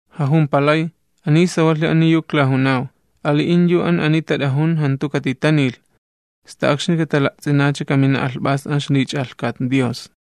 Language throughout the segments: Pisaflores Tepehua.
Jajumpalay: ―Sawalhi ani yu klajunaw, ali'in yu ani tat'ajun jantu katitanilh, sta akxni katala'ts'inacha kamina alhp'as an ixlich'alhkat Dios.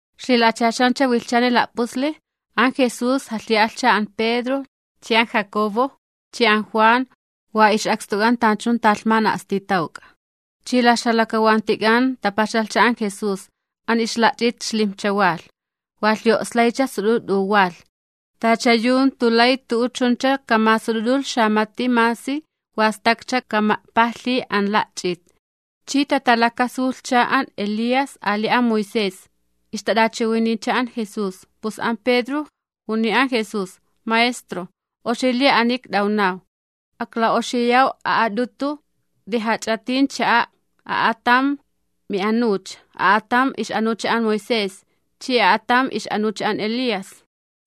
Ixlila'achaxancha wilhchan la'pusli, an Jesús jalhi'alhcha an Pedro chi an Jacobo chi an Juan wa ix'akstuk'an tanchun talhman a'stitawk'a. Chi la ixjalakawantichak'an tapaxalhcha an Jesús. An ixla'ch'it xlimjcha walh, wa lhi'o'slaycha sut'ut'u walh, tacha yu jantu lay tu'u chuncha kamasut'ut'ulh xamati masi wa stakcha kama'pajlhi an la'ch'it. Chi tatalakasulhcha an Elías ali an Moisés, ixtat'achiwiniycha an Jesús. Pus an Pedro juniy an Jesús: ―Maestro, oxi li ani ikt'awnaw, akla'oxiyaw a'at'utu de jach'itin cha'a', a'atam mi anucha, a'atam ix'anucha an Moisés chi a'atam ix'anucha an Elías.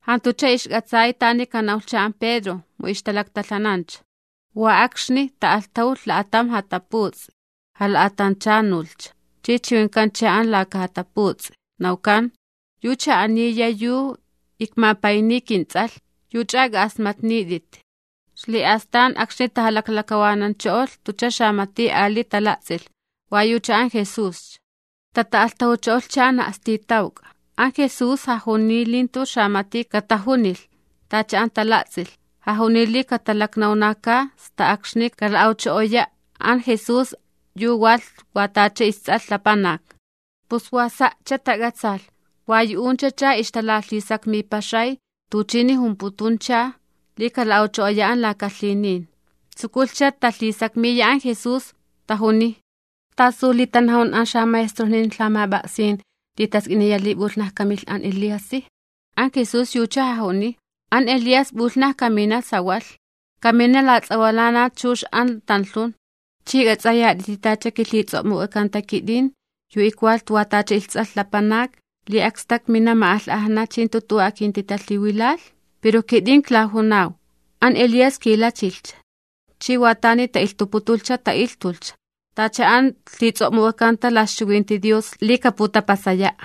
Jantucha ixk'atsay tani kanawlhcha an Pedro, mu ixtalaktalhanancha. Wa akxni ta'alhtajulh la'atam jataputs'i jala'atanchanulhcha, chi chiwinkalhcha an laka jataputs'i nawkan: ―Yucha aniya yu ikmapayniy kinTs'alh, yuch'a k'a'asmatnit'it. Xli'astan akxni tajalaklakawanancho'olh jantucha xamati ali tala'ts'ilh, wa yucha an Jesuscha. Tata'alhtajucho'olhcha an a'stitawk'a, an Jesús jajuniy li jantu xamati katajunilh tacha an tala'ts'ilh. Jajuniy li katalaknawnaka sta akxni kala'awcho'oya an Jesús an yu walh isTs'alh Lapanak. Pus wa sa'cha tak'atsalh. Wa yu'unchacha ixtalalhisakmipaxay tuchini jumputuncha li kala'awcho'oya an laka lhinin. Tsukulhcha talhisakmiya an Jesús, tajuniy: ―¿Tasu li tanajun an xamaestrojnin lhamap'a'sin li task'iniya li p'ulhnaja kamilh an Eliasi? An Jesús yucha jajuniy: ―An Elías p'ulhnaja kamina sawalh, kamina lats'awalana chux an tanlhun. ¿Chi k'ats'ayat'iti tacha kilhits'o'muk'akanta kit'in yu ikwalh wa tacha isTs'alh Lapanak, li akstak mina ma'alh'ajna chi jantu tu'u akintitalhiwilalh? Pero kit'in klajunaw an Elías kilachilhcha, chi wa tani ta'ilhtuputulhcha ta'ilhtulhcha, tacha an lhits'o'muk'akanta la ixchiwinti Dios li kaputapasaya'.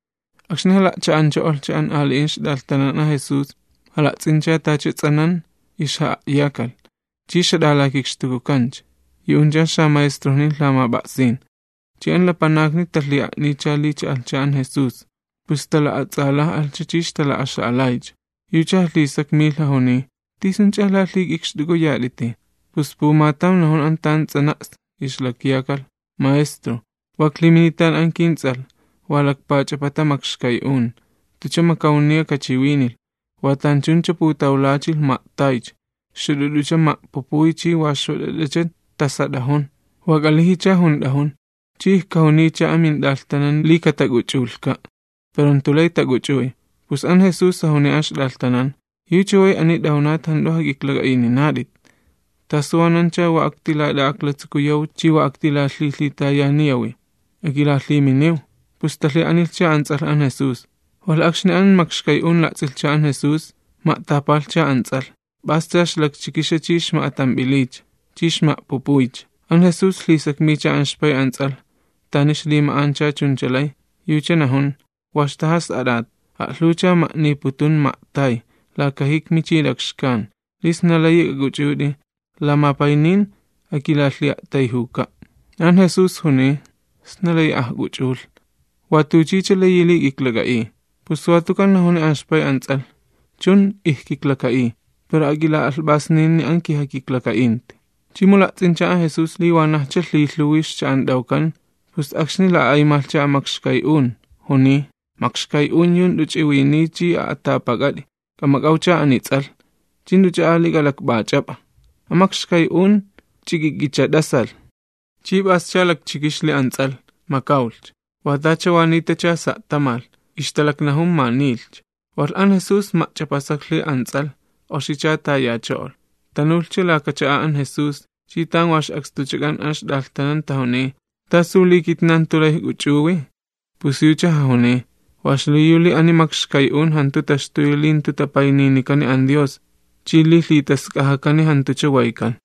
Akxni jala'cha'ancho'olhcha an ali'in ixt'alhtanan an Jesús, jala'ts'incha tacha ts'anan ixja'a'yakalh, chi ixjat'alakikxtukut'awkancha yu'uncha an xamaestrojnin lhamap'a'sin. Chi an lapanakni talhi'a'niycha li cha'alhcha an Jesús, pus tala'ats'alaj'alhcha chi ixtala'axa'alaycha. Yucha jalhisakmilh jajuniy: ―¿T'isunch'a lalhik'ikxt'uk'uyat'iti? Pus pumatam najun an tan ts'anan ixlakyakalh: ―Maestro, wa iklhiminitan an kints'alh wa lakpach'apata makxkay'un, jantucha makawniya kachiwinilh. Wa tanchuncha putawlachilh ma'taycha, xut'ut'ucha ma'pupuy chi wa xwat'at'acha tasat'ajun, wa k'alijicha junt'ajun, chi ijkajuniycha a mint'alhtanan li katak'uch'ulhka', pero jantu lay tak'uch'uy. Pus an Jesús jajuniy an ixt'alhtanan: ―¡Yu chaway ani t'awnat jant'u jak'iklak'a'ininat'it! ¿Tasu wanancha wa aktilat'a'aklatsukuyaw chi wa aktilalhilhitayaniyawi? Akilalhiminiw. Pus talhi'anilhcha an ts'alh an Jesús. Walh akxni an makxkay'un la'ts'ilhcha an Jesús, ma'tapalhcha an ts'alh, p'ascha ixlakchikixa chi ixma'atamp'iliycha, chi ixma'pupuycha. An Jesús lhisakmiycha an ixpay an ts'alh tani ixlima'ancha chuncha lay, yucha najun: ―Wa ixtajas'at'at, a'lhuwcha ma'niputun ma'tay laka jikmi chi lakxkan. Li sna layi k'ak'uchut'i lamapaynin akilalhi'a'tayjuka'. An Jesús juniy: ―¿Sna layi ajk'uch'ulh? Watuchicha layi li k'iklak'a'iy. Pus watukan najuni an ixpay an ts'alh: ―Chun, ijkiklaka'iy, pero ak'ila'alhp'asninini an kijakiklaka'inti. Chi mu la'ts'incha an Jesús li wanajcha lhilhuwi ixcha'ant'awkan, pus akxni la'a'aymalhcha an makxkay'un, juniy: ―Makxkay'un yu jant'u ch'iwiniy chi a'atapa, k'amak'awcha ani ts'alh, ch'i jant'uch'a ali k'alakp'ach'ap'a. An makxkay'un ch'ik'ik'icha t'asalh, chi p'ascha lakchikixli an ts'alh, makawlhcha, wa tacha wa nitacha sa' tamalh, ixtalaknajun ma niilhcha. Walh an Jesús ma'ch'apasaklhi an ts'alh, oxicha tayacho'olh. Tanulhcha laka cha'a an Jesús, chi tan wa ix'akstuchak'an an ixt'alhtanan tajuniy: ―¿Tasu li kitnan jantu lay ijk'uch'uwi? Pus yucha jajuniy: ―Wa xliyu li ani makxkay'un jantu taxtuyi li jantu tapayninikani an Dios [chi li jantu lhitask'ajakan kiwaytk'an].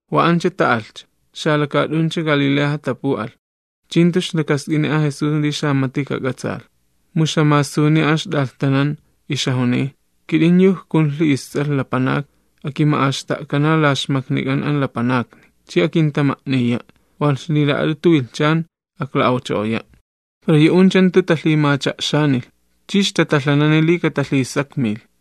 Wa ancha ta'alhcha, xalakaat'uncha Galileaja tapu'alh, chi jantu ixlakask'ini an Jesús li xamati kak'atsaalh. Mu ixjamasuniy an ixt'alhtanan ixjajuniy: “Kit'in yu ikjunlhi isTs'alh Lapanak akima'axta'kana la ixmaknik'an an lapanakni, chi akintama'niya', walh ixlila'at'utu wilhchan akla'awcho'oya'”. Pero yu'uncha jantu talhimacha'xanilh chi ixtatalhanani li katalhisakmilh.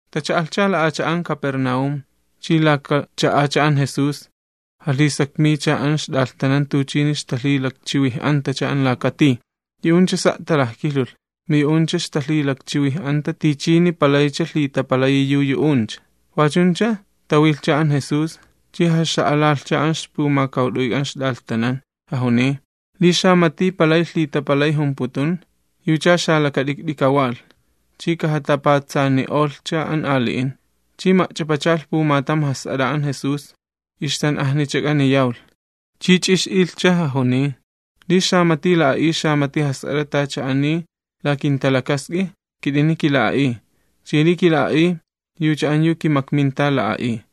Tacha'alhcha la'acha'an Capernaúm, chi laka cha'acha an Jesús, jalhisakmiycha an ixt'alhtanan tuchini ixtalhilakchiwij'antacha an laka tij. Yu'uncha sa' talajkilhulh, mu yu'uncha ixtalhilakchiwij'anta tichini palaycha lhitapalayi yu yu'uncha. Wachuncha tawilhcha an Jesús, chi jaxa'alalhcha an ixpumakawt'uyk'an ixt'alhtanan, jajuniy: ―Li xamati palay lhitapalay jumputun, yucha xalakat'ikt'i kawalh chi kajatapatsani'olhcha an ali'in. Chi ma'ch'apachalh pumatam jas'at'a an Jesús, ixtan'ajnichak'ani yawlh, chi ch'ix'ilhcha, jajuniy: ―Li xamati la'a'iy xamati jas'at'a tacha ani la kinta'a'ut, kit'ini kila'a'iy, chi li kila'a'iy, yucha an yu kimakminta la'a'iy.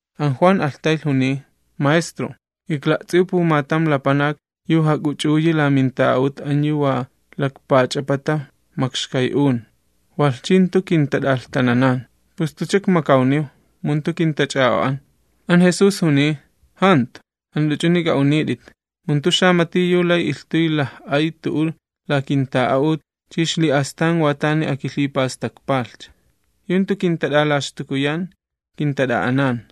An Juan alhtaylh, juniy: ―Maestro, ikla'ts'iw pumatam lapanak yu jak'uch'uyi la minta'a'ut an yu wa talakpach'apata makxkay'un, walh chi jantu kintat'alhtananan, pus jantucha ikmakawniw, mu jantu kintach'a'o'an. An Jesús juniy: ―Jantu, jant'u ch'uni k'a'unit'it, mu jantu xamati yu lay ilhtuy laj'ay tu'u la kinta'a'ut, chi xli'astan wa tani akilhipastakpalhcha. Yu jantu kintat'alaxtukuyan, kintat'a'anan.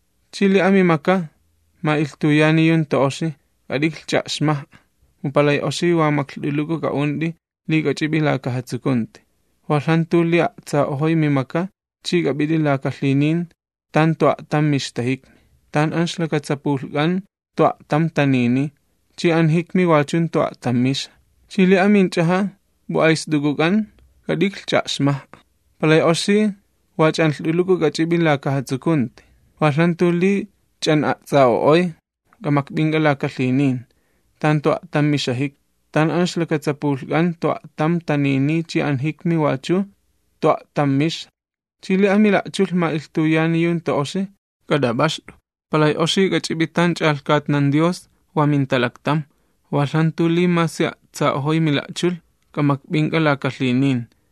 Chi li amimaka ma'ilhtuyani tala'alhin, k'at'iklh ch'a'xmaj'a, mu palay oxi wa maklht'uluku k'a'unt'i ch'i k'ach'ip'i laka jatsukunti, walh jantu li a'tsa'ojoy mi maka ch'i k'ap'it'i laka la'nin tan jantu a'tam mixta jikmi, [ tan an ixlakatsapulhk'an jantu a'tam taniniy, chi an jikmi wachu jantu a'tam mixa.] Chi li aminch'aja ma'ilhtuyani tala'alhin, k'at'iklh ch'a'xmaj'a, palay oxi wa ch'anlht'uluku k'ach'ip'i laka jatsukunti, walh jantu li ch'an'a'ts'a'o'oy k'amakp'ink'a laka la'nin, tan jantu a'tam mixa jikmi, [ tan an ixlakatsapulhk'an jantu a'tam taniniy chi an jikmi wachu jantu a'tam mixa.] Chi li amila'chulh ma'ilhtuyani tala'alhin, k'at'ap'axt'u, palay oxi k'ach'ip'i tan ch'alhkatnan Dios wa mintalaktam, walh jantu li masi a'tsa'ojoy mila'chulh k'amakp'ink'a laka la'nin,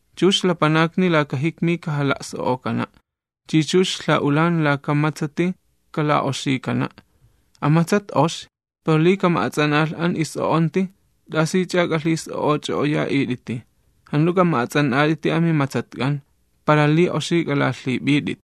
Chux lapanakni laka jikmi kajalhila'ts'intanukana', [chi chux lha'ulan laka matsati kas'o'okana'.] An matsat oxi, pero li kama'ats'an'alh an is'o'onti, ¿t'asich'a k'alhis'o'och'o'oya'it'iti? Jant'u k'ama'ats'an'at'iti amimatsatk'an, para li oxi k'alalhip'it'it.